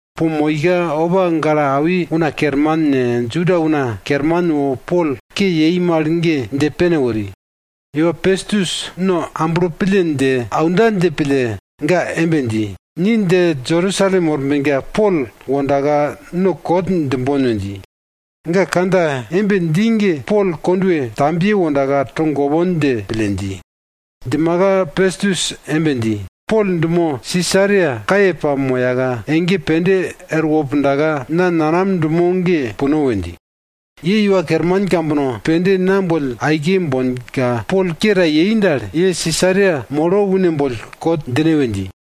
Po moika opa gale awi una kerman ne, Juda una kerman wo Pol ke yei mal ge dje pene wori. Iwa Pestus no amblo pille dje aunda dje pille ga embe dji, ni dje Jerusalem worbenka Pol wondaka no kot djimbon we dji. Ga kandja embe dji ge Pol kondwe tambiye wondaka togopon dje pille dji. Djimaka Pestus embe dji, Pol dumo Sisaria kaye pamoyaka, ege pende erwo pundaka na nanam dumo ge puno we dji. Ye iwa kerman kambono pende na boll aike bonka, Pol ke ta yei dal, ye Sisaria molo une boll kot djine we dji.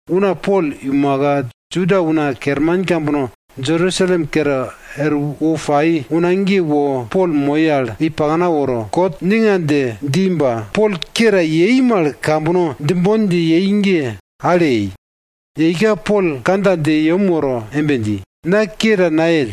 una Pol iumaka, Juda una kerman kambono Jerusalem kere erwo pai una ge wo Pol moi al i pakna woro, kot ninga dje dji ba Pol ke ta yei mal kambono djimbon dje yei ge kune nayei. Yeika Pol kandja dje yem woro embe dji, na ke ta nayell.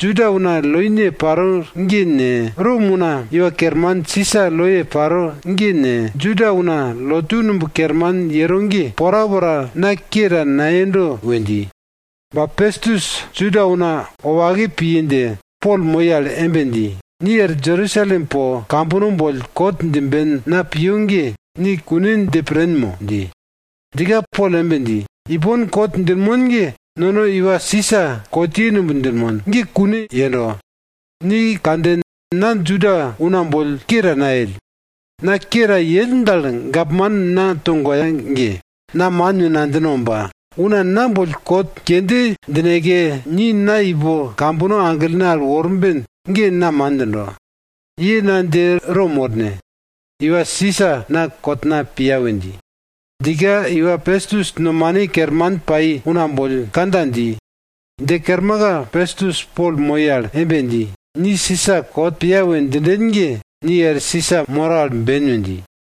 Juda una loine paro ge ne, Rom una iwa kerman Sisa loye paro ge ne, Juda una lotu numb kerman yero ge, porapora na ke ta nayendo we dji. Ba Pestus Juda una wopake piye dje, Pol moi al embe dji, ni er Jerusalem po kambono boll kot djimben na piyo ge, ni kune dje pren mo? dji. Djika Pol embe dji, ipon kot djinmon ge nono iwa Sisa kotye numb djinmon, ge kune yendo. Ni kanden, na Juda una boll ke ta nayell. Na ke ta yell dal gapman na togoya ge, na man we nadjino ba, una na boll kot kende djineke, ni na ipo kambono aglene al worben ge na man djindo. Ye na dje Rom worne, iwa Sisa na kotna piya we dji. Djika iwa Pestus, nomane kerman pai una boll kandja dji. Dje kermaka, Pestus Pol moi al embe dji, ni Sisa kot piya we djinden ge, ni er Sisa moro al ben we dji.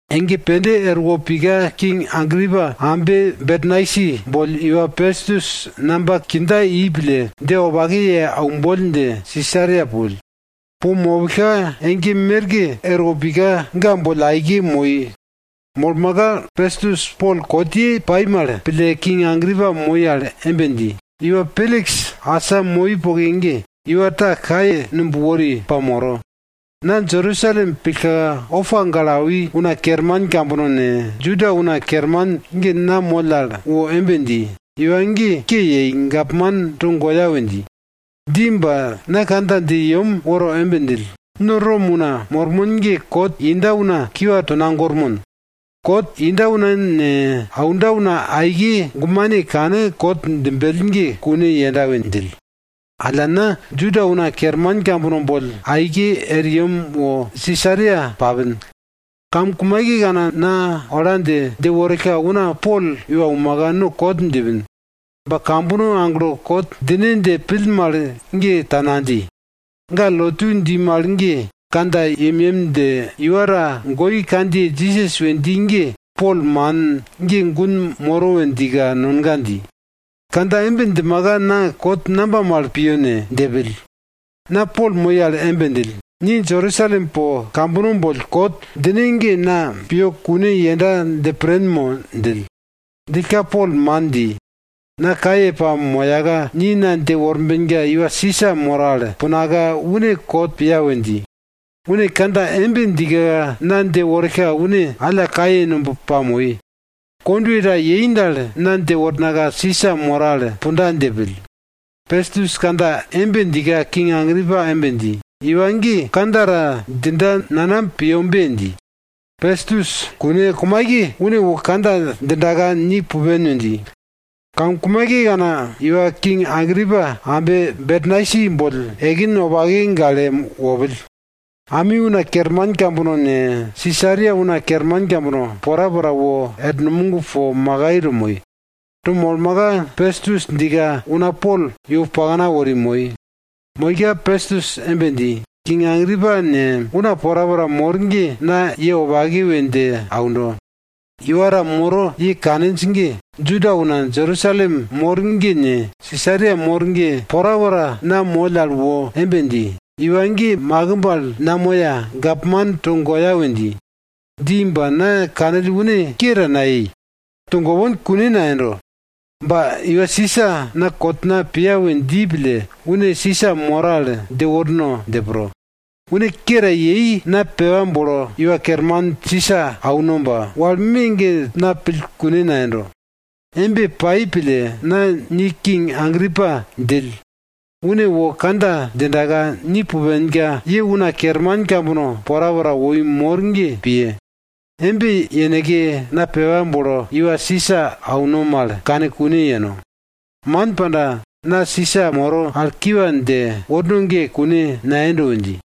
Ege pende erwo pika king Agripa ambe Bernaisi boll iwa Pestus namba kindja i pille, dje wopake ye aumboll dje Sisaria pupill. Po mopillka ege merke erwo pika ga boll aike moi. Molmaka, Pestus Pol kotye pai mal pille, king Agripa moi al embe dji, iwa Peliks asa moi poke ge, iwa ta kaye numb wori pamoro. Na Jerusalem pillka, opa gale awi una kerman kambono ne, Juda una kerman ge na moll al wo embe dji, iwa ge ke yei, gapman togoya we dji. Dji ba na kandja dje yem woro embe djill, no Rom una mormon ge kot inda una kiwa tonagormon. Kot inda una ne, aunda una aike gumane kane kot djimbell ge kune yenda we djill. Alla na, Juda una kerman kambono boll aike er yem wo Sisaria papin. Kamkumaikekana na ola dje, dje worillka una Pol iumaka no kot djipin. Ba kambono aglo kot djine dje pill mal ge ta nadji. Ga lotu dji mal ge kandja yemyem dje, iwa ta goi kandjiye Jisas we dji ge, Pol man, ge gun moro we djika nonga dji. Kandja embe djimaka na kot namba mal piyo ne? dje pill. Na Pol moi al embe djill, ni Jerusalem po kambono boll kot djine ge na piyo kune yenda dje pren mo? djill. Djillka Pol man dji, na kaye pamoyaka, ni na dje worbenka iwa Sisa moro al punaka, une kot piya we dji. Une kandja embe djika, na dje worillka une alla kaye numb pamoi. Kondwe ta yei dal, na dje wornaka Sisa moro al punda dje pill. Pestus kandja embe djika king Agripa embe dji, iwa ge kandja ta djinda nanam piyobe dji. Pestus, kune, kumaike une wo kandja djindaka ni pupen we dji. Kamkumaikekana, iwa king Agripa, ambe Bernaisi boll ekin wopake gale wopill. Ami una kerman kambono ne, Sisaria una kerman kambono, porapora wor numog po makai to moi. To molmaka, Pestus djika, una Pol iwo pakna wori moi. Moika Pestus embe dji, king Agripa ne, una porapora mor ge na ye wopake we dje aundo. Iwa ta moro ye kaninj ge, Juda una Jerusalem mor ge ne, Sisaria mor ge, porapora na moll al wo embe dji, iwa ge makimb al namoya, gapman togoya we dji. Dji ba na kanill une ke ta nayei, togopon kune nayendo. Ba iwa Sisa na kotna piya we dji pille, une Sisa moro al dje worno dje pro. Une ke ta yei, na pepa bolo iwa kerman Sisa auno ba wal me ge na pill kune nayendo. Embe pai pille na ni king Agripa djill, une wo kandja djindaka, ni pupenka, ye una kerman kambono porapora woi mor ge piye. Embe yeneke na pepa bolo iwa Sisa auno mal kane kune yeno. Man panda, na Sisa moro al kiwa dje worno ge kune nayendo we dji.